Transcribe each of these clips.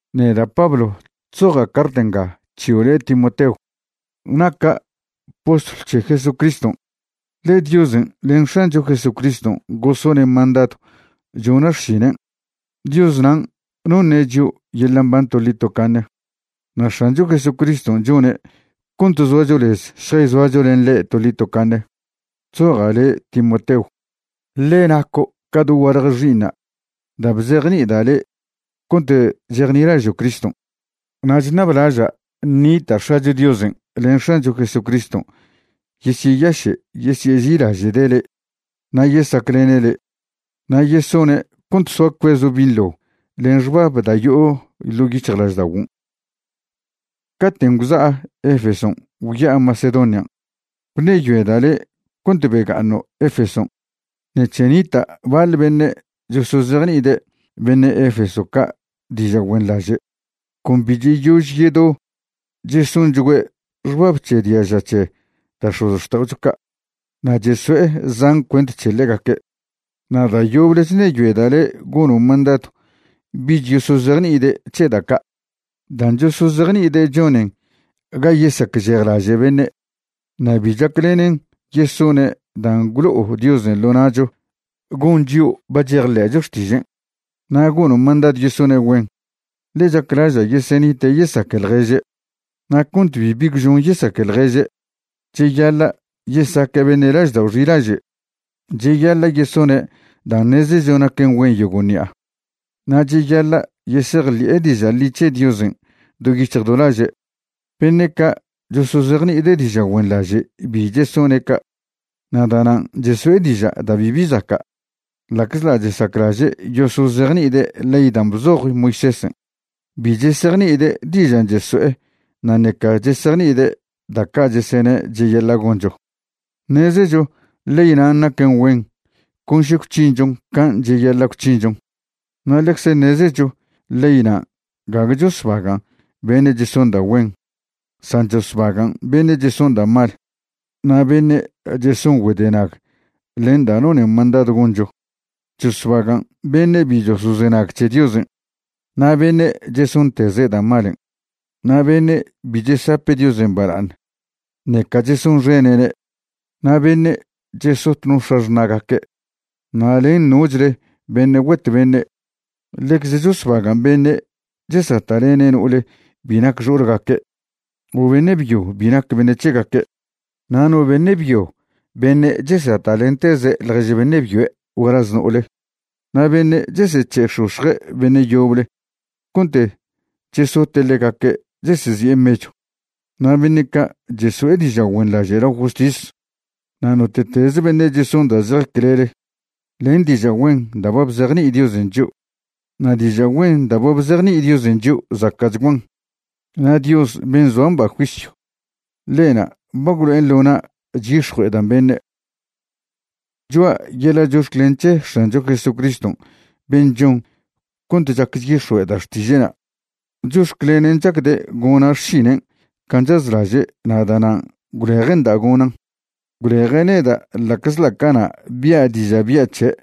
Neda' Pablo chzoja' cart nga c̱hio' le' Timoteo. Naca' postlw c̱he Jesucriston', ḻe Diosen' len X̱ancho Jesucriston' gosone' mandadw chona' xšinen'. Dios nan' noṉe' chio' yeḻa' mban toḻi tocaṉe na' X̱ancho Jesucriston' chone' cont zoacho lez šjayzoacho len ḻe' toḻi tocaṉe. Chzoja' le' Timoteo, ḻe naco' ca dogualje xi'iṉa' da' bzejni'ida' le' cont chejnilažo' Criston'. Na' chṉablaža' ṉita' X̱acho Diosen' len X̱ancho Jesucriston' yesyeyaše' yesyeži'ilaže'de' le' na' yesaclene' le', na' yesone' cont soa cuezo' binḻo len xbab da' yo'o ḻo' yic̱hjlažda'oguon'. Caten' gwza'a Efeson' gwya'a Macedonian' gwṉeyoeda' le' cont bega'aṉo' Efeson' ṉec̱he nita' baḻ beṉe' chosozejni'ide' beṉe' Efeso ca' diža' güenḻaže'. Con bi cheyož yedo chesonchgüe' xbab c̱he diaža c̱he da' x̱ozxta'ocho ca' na' cheso'e zan cuent c̱he ḻegaque'. Na' da' yoble chṉeyoeda' le' gono' mandadw bich yosozejni'ide' c̱he da' ca'. Dan' chosozejni'ide' chonen ga yesacžejlaže' beṉe', na' bi chaclenen yesone' dan' gwlo'o Diosen' ḻo na'cho gon chio' ba chejḻe'cho xtižen'. Na' gono' mandadw yesone' güen, ḻe chaclaža' yesenite' yesaque ḻježe'. Na' cont bibi gwžon yesaque ḻježe', cheyaḻa' yesaque' beṉe' laždao' xilaže', cheyaḻa' yesone' dan' ṉezecho naquen güen yogo' ṉi'a, na' cheyaḻa' yesejḻi'e diža' ḻi c̱he Diosen' do yic̱hj do laže'. Beṉe' ca' chosozejni'ide' diža' güenḻaže' bi chesone' ca', na' da'nan' cheso'e diža' da' bibi zaca'. Ḻa'czḻa' chesaclaže' yosozejni'ide' ley dan' bzoj Moisésen', bi chesejni'ide' dižan' cheso'e na' ṉeca chesejni'ide' da' ca' chesene' cheyaḻa' goncho. Ṉezecho ley nan' naquen güen con še gwc̱hinchon can' cheyaḻa' gwc̱hinchon. Na' ḻecze ṉezecho ley nan' gague chosbagan' beṉe' cheson da' güen, san chosbagan' beṉe' cheson da' mal na' beṉe' cheson güedenag len dan' nonen mandadw goncho. Chosbagan' beṉe' bi chosozenag c̱he Diosen', na' beṉe' chesonteze' da' malen', na' beṉe' bi chesape' Diosen' bala'aṉ ṉeca chesonxene'ne', na' beṉe' chesot no x̱axṉa'gaque', na' len nochle beṉe' güet beṉe'. Ḻecze chosbagan' beṉe' chesata'lene' no'ole bi nac xo'olgaque' o beṉe' byo bi nac beṉe' c̱hegaque', na' no beṉe' byo beṉe' chesata'lenteze' ḻjež beṉe' byoe' gualaz no'ole, na' beṉe' chesec̱he'x̱ox̱je' beṉe' yoble cont chesote' ḻegaque' chesezi'e mechw, na' beṉe' ca' chesonḻaže', na' beṉe' ca' cheso'e diža' güenḻaže' lao justis, na' note'teze beṉe' cheson da' zej clele len diža' güen da' ba bzejni'i Diosen' chio'. Na' diža' güen da' ba bzejni'i Diosen' chio' zaca'chguan, na' Dios ben' zoa mba juisyw, ḻe'na' ba gwlo'en ḻo na' chyix̱jue'edan' beṉe'. Choa' yeḻa' chox̱clen c̱he X̱ancho Jesucriston' ben' chon cont chac chyix̱jue'eda' xtiže'na'. Chox̱clenen' chacde' gona' xšinen' can' chazlaže' na' da'nan' gwleje'nda' gonan'. Gwleje' neda' ḻa'czḻa' cana' bia' diža' bya' c̱he'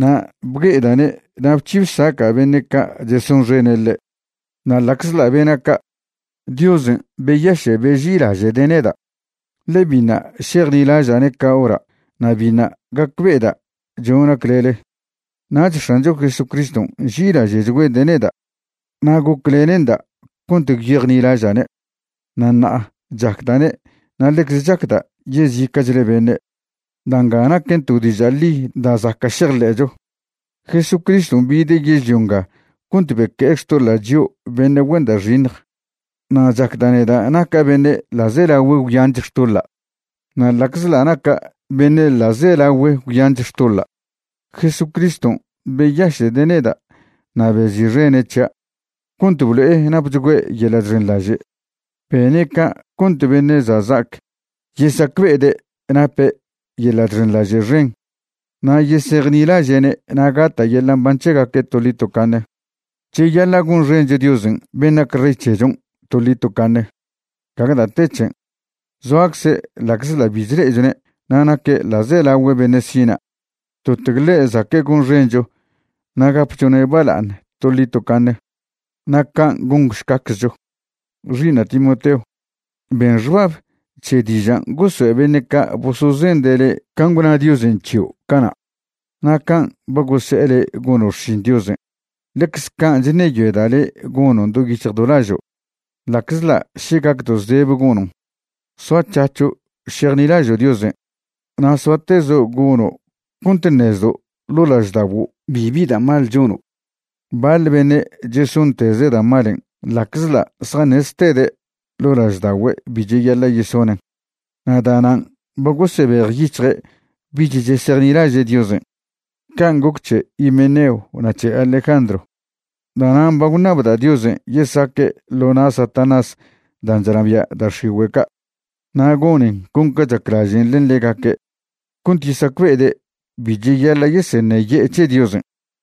na' bgue'eda'ne' na' bc̱hi bsaca' beṉe' ca' chesonxene' ḻe'. Na' ḻa'czḻa' bena' ca', Diosen' beyaše' beži'ilaže'de' neda', ḻe biṉa' šejnilaža'ne' ca hora' na' biṉa' gacbe'eda' chona' clele. Nach X̱ancho Jesucriston' nži'ilaže'chgüede' neda' na' goclene'nda' cont gwyejnilaža'ne', na' ṉa'a chacda'ne' na' ḻecze chacda' yezica'chle beṉe'. Da' nga naquen to diža' ḻi da' zaca' šejḻe'cho: Jesucriston' bide' yežlio nga cont beque'e xtoḻa' chio' beṉe' güen da' xiṉj. Na' chacda' neda' naca' beṉe' ḻa'zelagüe gwyanch xtoḻa'. Na' ḻa'czḻa' naca' beṉe' ḻa'zelagüe gwyanch xtoḻa', Jesucriston' beyaše'de' neda' na' bezi'xene' c̱hia' cont blo'e napchgüe' yeḻa' chxenḻaže'. Bene' ca' cont beṉe' za' za'ac yesacbe'ede' nape' yeḻa' chxenḻaže' xen na' yesejnilaže'ne' na' gata' yeḻa' mban c̱hegaque' toḻi tocaṉe. Cheyaḻa' gonxencho Diosen' ben' nac Rey c̱hechon' toḻi tocaṉe. Gague da' te c̱hen'. Zoacze' ḻa'czḻa' bi chle'echone' na' naque' ḻa'zelagüe beṉe' sina'. Totc ḻe' zaque' gonxencho na' gapchone' bala'aṉ toḻi tocaṉe. Na' can' gonšcaczcho. Xi'iṉa' Timoteo, ben xbab c̱he dižan' gosoe' beṉe' ca' bosozende' le' can' gwna Diosen' c̱hio' cana'. Na' can' ba gose'e le' gono' xšin Diosen', ḻecze can' chṉeyoeda' le' gonon' do yic̱hj do lažo', ḻa'czḻa' še gacdo' zdebe gonon'. Soac̱hac̱ho' šejnilažo' Diosen', na' soatezo' gono' cont ṉezdo' ḻo' laždaguo' bibi da' mal chono'. Baḻ beṉe' chesonteze' da' malen' ḻa'czḻa' zjaṉeztede' ḻo' lažda'ogüe' bi cheyaḻa' yesonen', na' da'nan' ba gosebejyic̱hje' bich chesejnilaže' Diosen'. Can' goc c̱he Himeneo na' c̱he Alejandro. Da'nan' ba gwṉabda' Diosen' yesaque' ḻo na' Satanás dan' chnabia' da' x̱igüe' ca', na' gonen con ca chaclažen' len ḻegaque' cont yesacbe'ede' bi cheyaḻa' yeseṉeye'e c̱he Diosen'.